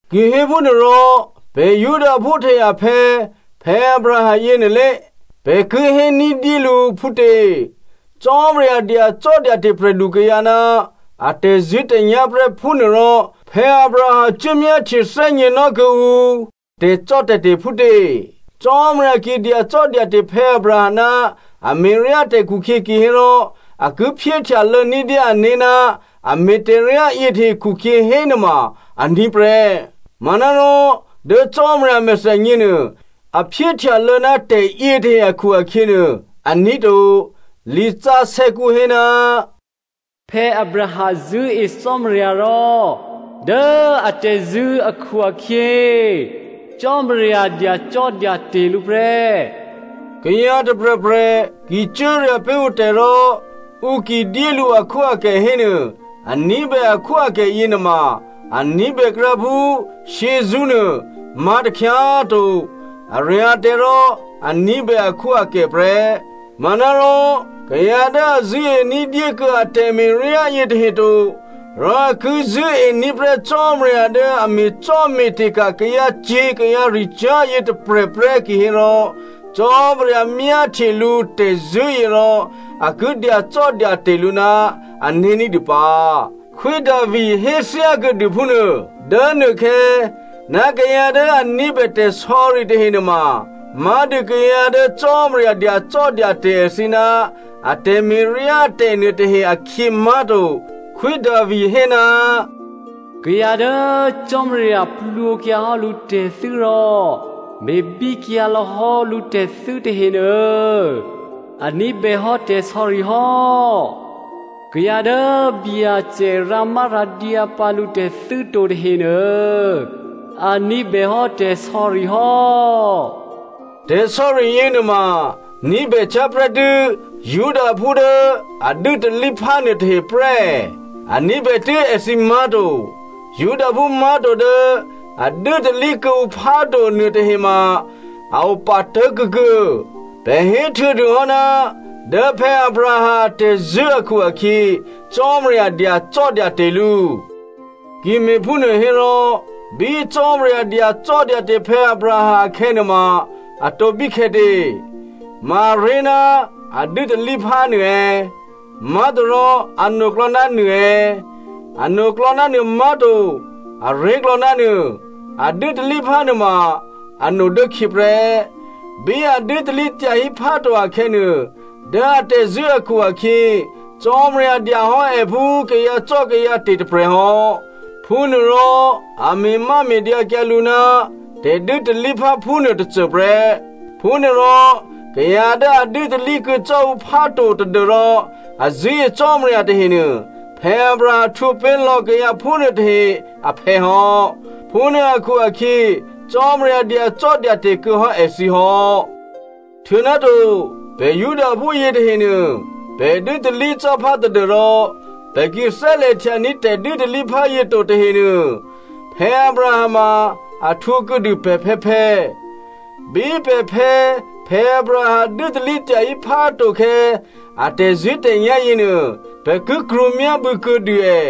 Kihéphúnuôrò, pè̤ Judaphú tahe aphè̌ Abraham yěnuôlé, pè̤ ki hé ní̤dyé lǔ phútě? Cò́marya dyacò́dyate̤ prè̤lukayǎ ná a tè̤zṳ̂́tè̤nyá̤ prè́ phúnuôrò Abraham cuốmyáhtye thè́gně nò́ kuô̌ǔ tè̤cò́tè̤te̤ phútě? Cò́marya ki dyacò́dyate̤ Abraham ná a me̤ryá tè̤ khukhyě kihérò a ki phyéhtyalô̌ ní̤dyé ané̤ ná a me̤ tè̤ryá yětahe khukhyě hénuôma aní̤ prè́. Manárò dố Cò́marya a mèthènyě nuô, a phyéhtyalô̌ ná tè̤yětahe akhu-akhyě nuô aní̤ to. Lisǎsè̌kǔ hé, “Abraham zṳ̂́e Cò́marya rò dố atè̤zṳ̂́ akhu-akhyě, Cò́marya dyacò́dyate̤ lǔ prè́.” Kayǎ tôprè̤prè̤ ki cuốrya̤ pé̤ ǔtè̤ rò ǔ ki dyé lǔ akhwóakè hénuô, a ní̤bè akhwóakè yěnuôma a ní̤bèkrǎ phú shyězṳ́nuô má̤ takhyá꤮ to. A rya̤tè̤ rò a ní̤bè akhwóakè prè́. Manárò kayǎ dố a zṳ̂́e ní̤dyé kuô̌ a tè̤me̤ryá yětahe to, rò a ki zṳ̂́ení̤ prè́ Cò́marya dố a me̤cò́me̤te̤ ka̤ kayǎcyě̤ kayǎricyá̤ yě tôprè̤ prè́ kihérò, Cò́marya myáhtye lǔ tè̤zṳ̂́yě rò a ki dyacò́dyate̤ lǔ ná ané̤ ní̤dû pǎ. Khwí Davi hé thyákuô̌dû phúnuô dố nuôkhè̌, kayǎ dố a ní̤bè tè̤sò̌ri tahe nuôma má̤dû kayǎ dố Cò́marya dyacò́dyate̤ èthǐ ná a tè̤me̤ryátè̤ nuôtahe akhyě má̤to. Khwí Davi hé, “Kayǎ dố Cò́marya plwǒkyǎ hò́ lǔtè̤thû́ rò me̤bíkyǎ lò̌hò́ lǔtè̤thû́ tahenuô, a ní̤bèhò́ tè̤sò̌ri hò́. Kayǎ dố Byacè rǎmárǎdyǎ pǎ lǔtè̤thû́ to tahenuô, a ní̤bèhò́ tè̤sò̌ri hò́.” Tè̤sò̌ri yěnuôma ní̤bècyá̤ prè́tû́ Judaphú dố a dû́talíphá nuôtahe prè́ è̌? A ní̤bè tû́ èthǐ má̤to. Judaphú má̤to dố a dû́talí kuô̌ǔ phá to nuôtahe ma a opatố̤ kuô̌kuô̌. Pè̤ héhtuô̌dûhò́, dố Abraham atè̤zṳ̂́ akhu-akhyě Cò́marya dyacò́dyate̤ lǔ. Ki me̤phúnuô hérò bí Cò́marya dyacò́dyate̤ Abraham akhè̌nuôma atǒ bíkhè̌tě? Ma aré̤ ná a dû́talíphá nuô è̌? Má̤torò anoklò̌ ná nuô è̌? Anoklò̌ ná nuô má̤to, aré̤klò̌ ná nuô. A dû́talíphá nuôma ano dố khyě prè́. Bí a dû́talí tyahí phá to akhè̌nuô, dố atè̤zṳ̂́ akhu-akhyě Cò́marya dyahò́ è phú kayǎcò́kayǎte̤ tôprè̤hò́, phúnuôrò a me̤máme̤dyǎkyǎ lǔ ná tè̤dû́talíphá phúnuô tôcô prè́. Phúnuôrò kayǎ dố a dû́talí kuô̌ cò́ǔ phá to tadû́rò, a zṳ̂́e Cò́marya tahenuô, Abraham htwǒ pé̤ lò̌ kayǎ phúnuô tahe aphè̌ hò́. Phúnuô akhu-akhyě Cò́marya dyacò́dyate̤ kuô̌hò́ èthǐ hò́. Htuô̌náto, pè̤ Judaphú yětahenuô, pè̤ dû́talí cò́ phá tadû́rò pè̤ ki thè́lè̤htyaní̤ tè̤dû́talíphá yě to tahenuô, Abraham ma a htwǒ kuô̌dû pè̤phè̌phè̌. Bí pè̤phè̌ Abraham dû́talí tyahí phá to khè̌ a tè̤zṳ̂́tè̤nyá̤ yěnuô, pè̤ ki krwǒ myábû̌ kuô̌dû è.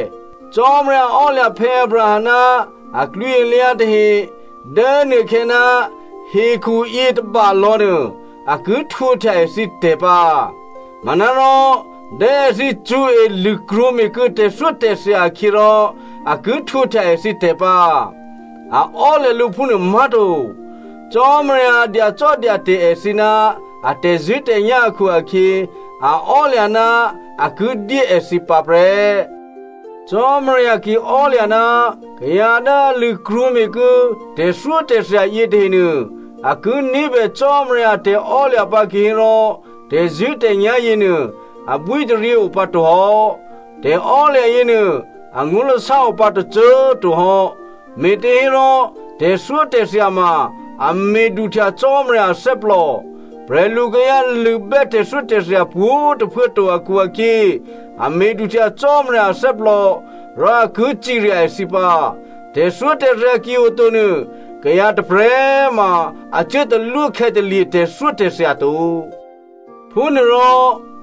Cò́marya ò́lya̤ Abraham ná aklwǐalyǎ tahe dố nuôkhè̌ ná hekhu yětôbalò̌ nuô, a ki htwǒhtya èthǐtè̤ pǎ. Manárò dố èthǐ cṳ̌e lṳ̂krwǒ me̤kuô̌ tè̤thyótè̤thya akhyě rò a ki htwǒhtya èthǐtè̤ pǎ, a ò́lya̤ lǔ phúnuô má̤to. Cò́marya dyacò́dyate̤ èthǐ ná a tè̤zṳ̂́tè̤nyá̤ akhu-akhyě, a ò́lya̤ ná a ki dyé èthǐ pǎ prè́. Cò́marya ki ò́lya̤ ná kayǎ dố a lṳ̂krwǒme̤ kuô̌ tè̤thyótè̤thya yětahenuô a ki ní̤bè Cò́marya a tè̤ò́lya̤ pǎ kihérò tè̤zṳ̂́tè̤nyá̤ yěnuô abwítaryě o pǎ to hò́. Tè̤ò́lya̤ yěnuô angó̤lasá opǎ tôcô꤮ to hò́. Me̤těhérò tè̤thyótè̤thya ma a me̤ duhtya Cò́marya athè́plò. Prè̤lu kayǎ lṳ̂bè́ tè̤thyótè̤thya pwǒ̤꤮ tôphuố to akhu-akhyě, a me̤duhtya Cò́marya athè́plò rò a ki cirya èthǐ pǎ. Tè̤thyótè̤thya ki oto nuô kayǎ tôprè̤꤮ ma a cuốtalwó khè̌talye̤ tè̤thyótè̤thya to. Phúnuôrò,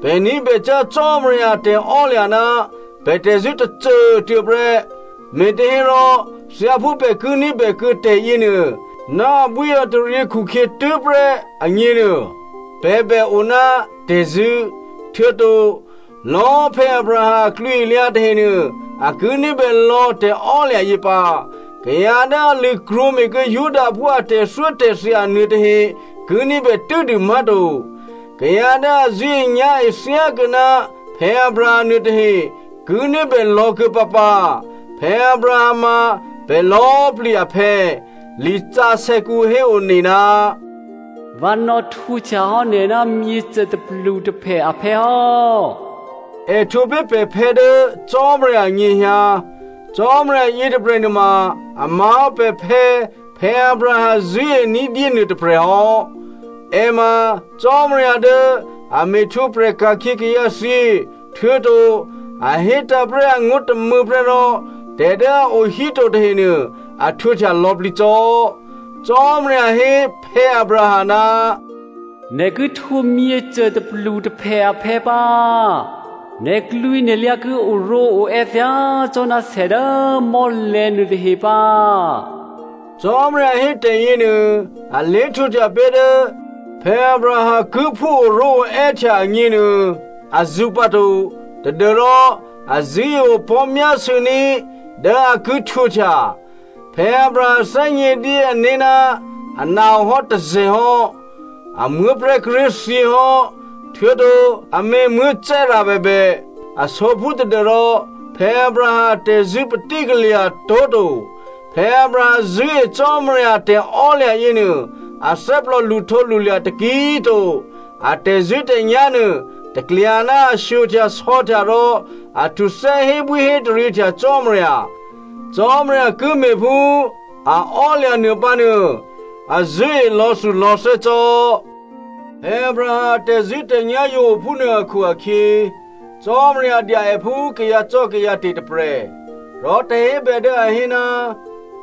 pè̤ ní̤bècyá̤ Cò́marya a tè̤ò́lya̤ ná pè̤ tè̤zṳ̂́ tôcô꤮ tuô̌ prè́. Me̤těhérò thyáphú pè̤ ki ní̤bè kuô̌ tè̤yěnuô ná abwíataryě khukhyě tû́prè́ agněnuô, pè̤ bè o ná tè̤zṳ̂́. Htuô̌to, lò̌꤮ Abraham aklwǐalyǎ tahenuô a ki ní̤bè lò̌ tè̤ò́lya̤ yě pǎ. Kayǎ dố a lṳ̂krwǒme̤kuô̌ Judaphú a tè̤thyótè̤thya nuôtahe ki ní̤bè tû́dû má̤to, kayǎ dố a zṳ̂́enyá̤e thyákuô̌ ná Abraham nuôtahe ki ní̤bè lò̌kuô̌ pǎpǎ. Abraham ma pè̤ lò̌꤮ plǐ aphè̌. Lisǎsè̌kǔ héone, “Vǎ nò̌htwǒhtya hò́ nè̤ ná myěcô tôplutôphè aphè̌ hò́.” È htwǒ pé̤ pè̤phè̌ dố Cò́marya anyěhyǎ. Cò́marya yětôprè̤ nuôma a má̤hò́ pè̤phè̌ Abraham zṳ̂́ení̤dyé nuôtôprè̤ hò́. È ma Cò́marya dố a me̤htwǒprè̤ ka̤khyě kayǎthyě, htuô̌to a hétǎ̤ prè́ angó̤ tômû̌ prè́ rò tè̤ dố a o híto tahenuô a htwǒhtya lò̌plǐ cò́. Cò́marya hé Abraham, “Nè̤ ki htwǒ myěcô tôplutôphè aphè̌ pǎ. Nè̤klwǐnè̤lyǎ ki oró̤oè́ thyácò́ná sè dố mò́lè̤̌ nuôtahe pǎ.” Cò́marya hé tè̤yěnuô alé̤ htwǒhtya pé̤ dố Abraham ki phú oró̤oè́htya agněnuô azǔ pǎto tadû́rò a zṳ̂́e opò̤́ myásû̌ní̤ dố a ki htwǒhtya. Abraham thè́gnědyé ané̤ ná ana ohò́ tôzè̤ hò́, a muố̤prè̤́ kíré̤ thyěhò́, htuô̌to amě Sara bèbè, a sǒphú tadû́rò Abraham atè̤zṳ̂́ patí kalya̤ tó̤ to. Abraham zṳ̂́e Cò́marya a tè̤ò́lya̤ yěnuô athè́plò lṳhtǒlṳlya̤ taki꤮ to. A tè̤zṳ̂́tè̤nyá̤ nuô, taklya ná a shyohtyasò̌htya rò a htuthè́ hébwíhétaryěhtya Cò́marya. Cò́marya ki me̤ phú a ò́lya̤ nuôpǎ nuô, a zṳ̂́e lò̌thulò̌thè́ cò́. Abraham a tè̤zṳ̂́tè̤nyá̤ yǒ ophúnuô akhu-akhyě, “Cò́marya dya è phú kayǎcò́kayǎte̤ tôprè̤.” Rò tè̤hébè dố a hé,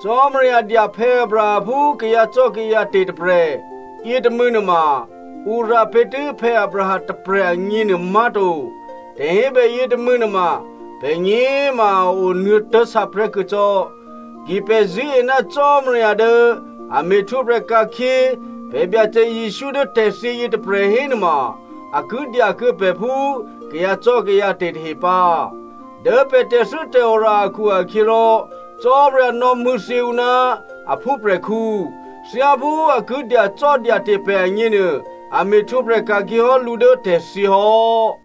“Cò́marya dya Abraham phú kayǎcò́kayǎte̤ tôprè̤,” yětômû̌ nuôma, ǔ rǎ pé̤tû́ Abraham tôprè̤ agněnuô má̤to. Tè̤hébè yětômû̌ nuôma, pè̤gně꤮ ma a onuô̌tố̤ sǎprè̤́ kuô̌ cò́. Ki pè̤ zṳ̂́e ná Cò́marya dố a me̤htwǒprè̤ ka̤khyě pè̤ Byacè Jesǔ dố tè̤thyě yětôprè̤ hénuôma a ki dyakuô̌ pè̤ phú kayǎcò́kayǎte̤ tahe pǎ. Dố pè̤ tè̤thû́tè̤ora akhu-akhyěrò Cò́marya nò̌mṳ̂̌thyě ǔ ná a phúprè̤khǔ. Thyáphú a ki dyacò́dyate̤ pè̤ agněnuô, a me̤htwǒprè̤ ka̤khyě hò́ lǔ dố tè̤thyě hò́.